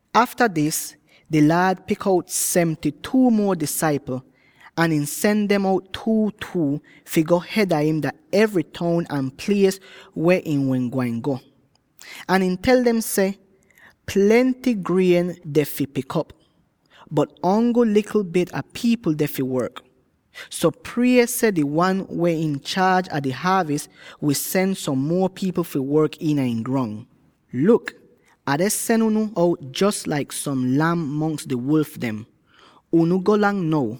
Afta dis, di Laad pik out seventy-two Nuotis seh: Som uol taim teks seh seventy insida seventy-two. muo disaipl. Ahn ihn sen dem out two-two, fi go hed a im dah evry toun ahn plies weh ihn wehn gwain go. Ahn ihn tel dem seh, “Plenty grien deh fi pik, bot ongl likl bit a pipl deh fi work. So prie seh di Wan weh inchaaj a di haavis wi sen som muo pipl fi work iina ihn grong. Luk, Ah deh sen unu out jos laik som lam mongs di wolf dem. Unu golang now!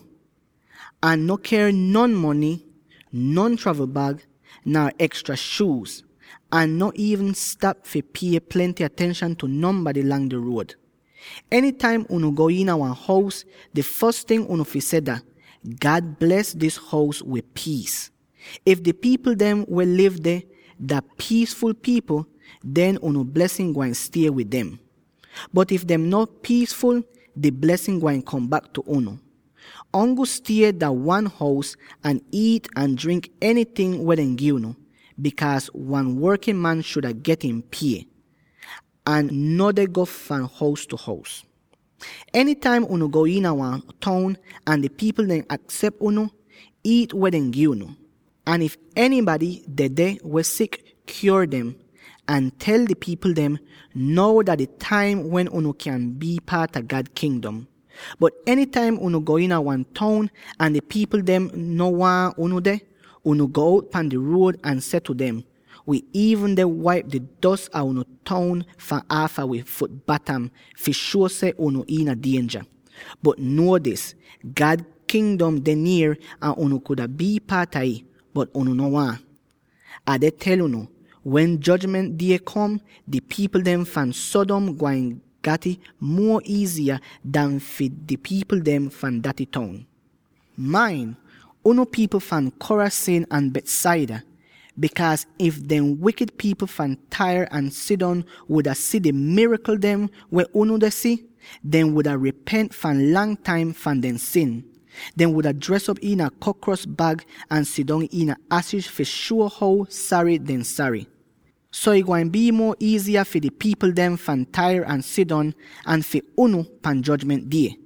Ahn no ker non mony, non travln bag, nar ekstra shuuz, ahn no iivn stap fi pie plenty atenshan tu nonbady lang di ruod. “Enytaim unu go iina wan hous, di fos ting unu fi seh dah, ‘God bles dis hous wid piis.’ If di pipl dem weh liv deh dah piisful pipl, den unu blesin gwain stie wid dem, bot if dehn no piisful, di blesin gwain kom bak tu unu. Ongl stie dah wan hous, ahn iit ahn drink enyting weh dehn gi unu, bikaaz wan workin man shuda get ihn pie. Ahn no deh go fahn hous tu hous. “Enytaim unu go iina wan toun ahn di pipl dehn aksep unu, iit weh dehn gi unu. Ahn if enybady dedeh weh sik, kyuor dem; ahn tel di pipl dem, ‘Now dah di taim wen unu kyan bii paat a God Kingdom.’ Bot enytaim unu go iina wan toun ahn di pipl dem no waahn unu deh, unu go out pan di ruod ahn seh tu dem, ‘Wi iivn deh waip di dos a unu toun fahn aafa wi fut batam fi shuo seh unu iina dienja. Bot nuo dis: God Kingdom deh nier ahn unu kuda bii paat a ih, bot unu no waahn.’ Ah deh tel unu: wen Jojment Die kom, di pipl dem fahn Sodom gwain gat'ih muo iiziya an fi di pipl dem fahn daty toun. “Main, unu pipl fahn Chorazin ahn Bethsaida, bikaaz if dehn wikid pipl fahn Tyre ahn Sidon wuda si di mirakl dem weh unu deh si, dehn wuda ripent fahn lang taim fahn dehn sin. Dehn wuda dres iina krokos bag ahn sidong iina ashis fi shuo how sary dehn sary. So ih gwain bii muo iiziya fi di pipl dem fahn Tyre ahn Sidon an fi unu pan Jojment Die!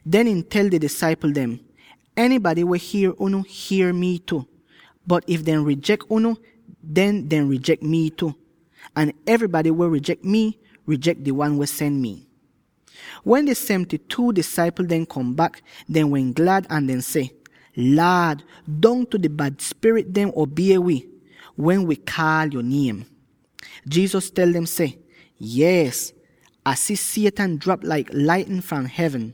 Den ihn tel di disaipl dem, “Enybady weh hier unu, hier mi tu. Bot if dehn rijek unu, den dehn rijek mii tu. Ahn enybady weh rijek mi, rijek di wan weh sen mii.” Wen di seventy-two disaipl dem kom bak, dehn wehn glad, ahn dehn seh, “Laad, dongtu di bad spirit dem obie wi, wen wi kaal yo niem!” Jesus tel dem seh, “Yees, Ah si Satan drap laik laitnin fahn hevn.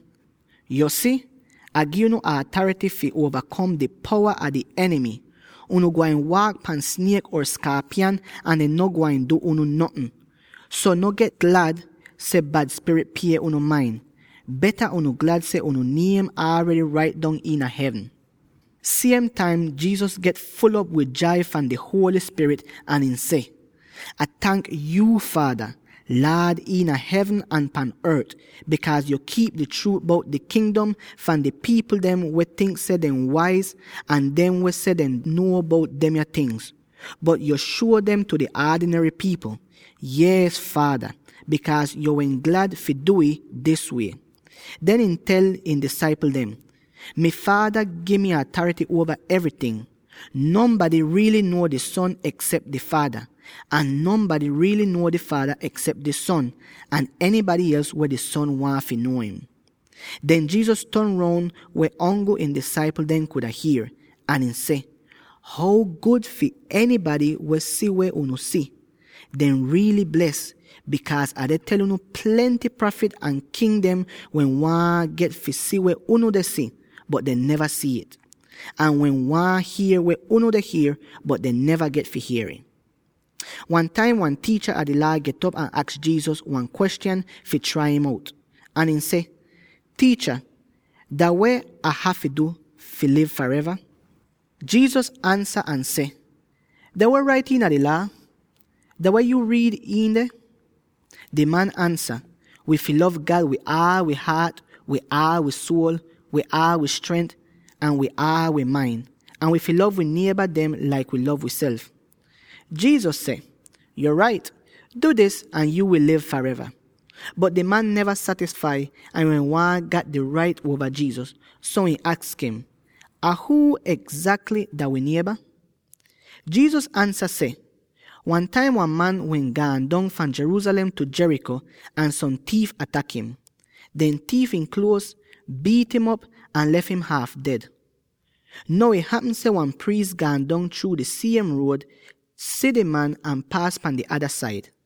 Yo si, Ah gi unu atarity fi uova-kom di powa a di enimy. Unu gwain waak pan sniek or skaapyan, ahn dehn no gwain du unu notn. So, no get glad seh bad spirit pie unu main; beta unu glad seh unu niem don rait dong iina hevn!” Siem taim, Jesus get ful'op wid jai fahn di Holy Spirit ahn ihn seh, “Ah tank yuu, Faada, Laad iina hevn ahn pahn ort, bikaaz yo kiip di chruut bout di Kingdom fahn di pipl dem weh tink seh dehn waiz ahn dem weh seh dehn nuo bout demya tingz, bot yo shuo dem tu di aadinary pipl. Yees Faada, bikaaz yo wehn glad fi du'ih dis wie.” Den ihn tel ihn disaipl dem, “Mi Faada gi mi atarity uova evryting. Nonbady riily nuo di Son eksep di Faada, ahn nonbady riily nuo di Faada eksep di Son, ahn enybady els weh di Son waahn fi nuo im.” Den Jesus ton roun weh ongl ihn disaipl dem kuda hier, ahn ihn seh, “How gud fi enybady weh si weh unu si; dehn riily bles. Bikaaz Ah deh tel unu: plenty prafit ahn king dehn wehn waahn get fi si weh unu deh si, bot dehn neva si'it; ahn wehn waahn hier weh unu deh hier, bot dehn neva get fi hier'ih.” Wan taim wan tiicha a di Laa get'op ahn aks Jesus wan kwestyan fi trai im out; ahn ihn seh, “Tiicha, dah weh Ah hafy du fi liv fareva?” Jesus ansa ahn seh, “Dah weh rait iina di Laa? Dah weh yuu riid iin deh?” Di man ansa, “Wi fi lov God wid aal wi haat, wid aal wi suol, wid aal wi strent ahn wid aal wi main; ahn wi fi lov wi nieba dem laik wi lov wiself.” Jesus seh, “Yo rait man, du dis ahn yuu wi liv fareva.” Bot di man neva satisfai, ahn ihn wehn waahn gat di rait uova Jesus, so ihn aks im, “Ahn huu egzakly dah mi nieba?” Jesus ansa seh, “Wan taim wan man wehn gaan dong fahn Jerusalem tu Jericho ahn som tiif atak im. Dem tiif ihn kluoz, biit'im op ahn lef im haaf ded. Now ih hapm seh wan priis gaan dong chruu di siem ruod, si di man, ahn paas pan di ada said!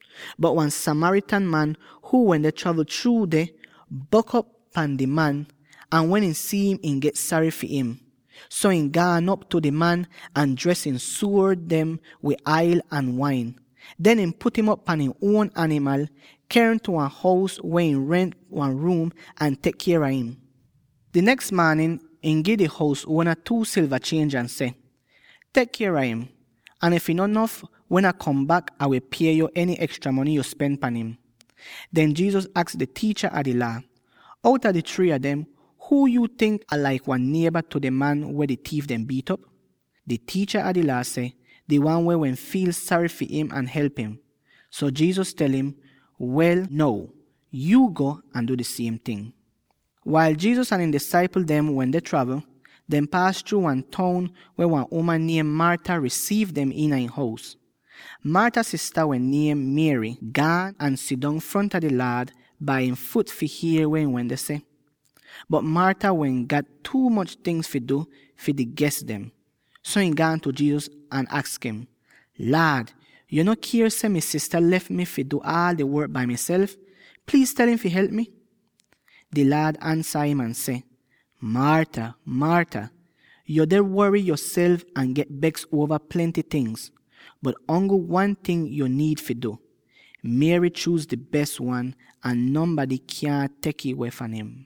Bot wan Samaritan man, huu wende travl chruu deh, bok'op pahn di man, ahn wen ihn si'im, ihn get sary fi him. So, ihn gaan op tu di man, ahn dres ihn suor dem wid ail ahn wain. Den ihn put im op pan ihn uon animal, ker im tu wan hous weh ihn rent wan ruum ahn tek kier a im. Di neks maanin ihn gi di hous uona two silva chienj ahn seh, ‘Tek kier a im, ahn if ih no nof, wen Ah kom bak, Ah wi pie yo eny ekstra mony yo spen pan im.’” Den Jesus aks di tiicha a di Laa seh, “Outa di three a dem, huu yuu tink ak laik wan nieba tu di man weh di tiif dem biit'op?” Di tiicha a di Laa seh, “Di wan weh wehn fiil sary fi im ahn help im.” So Jesus tel im, “Wel now, yuu go ahn du di siem ting.” Wail Jesus ahn ihn disaipl dem wende travl, dehn paas chruu wan toun weh wan uman niem Martha risiiv dem iina ihn hous. Martha sista —weh niem Mary— gaan ahn sidong fronta di Laad bai ihn fut dem fi hier weh ihn wende seh. Bot Martha wehn gat tuu moch tingz fi du fi di ges dem, so ihn gaan tu Jesus ahn aks im, “Laad, yo no kier seh mi sista lef mi fi du aal di work bai miself? Pliiz tel im fi help mi!” Di Laad ansa im ahn seh, “Martha, Martha, yo deh wory yoself ahn get beks uova plenty ting, bot ongl wan ting yo niid fi du. Mary chuuz di bes wan ahn nonbady kyaahn tek'ih weh fahn im.”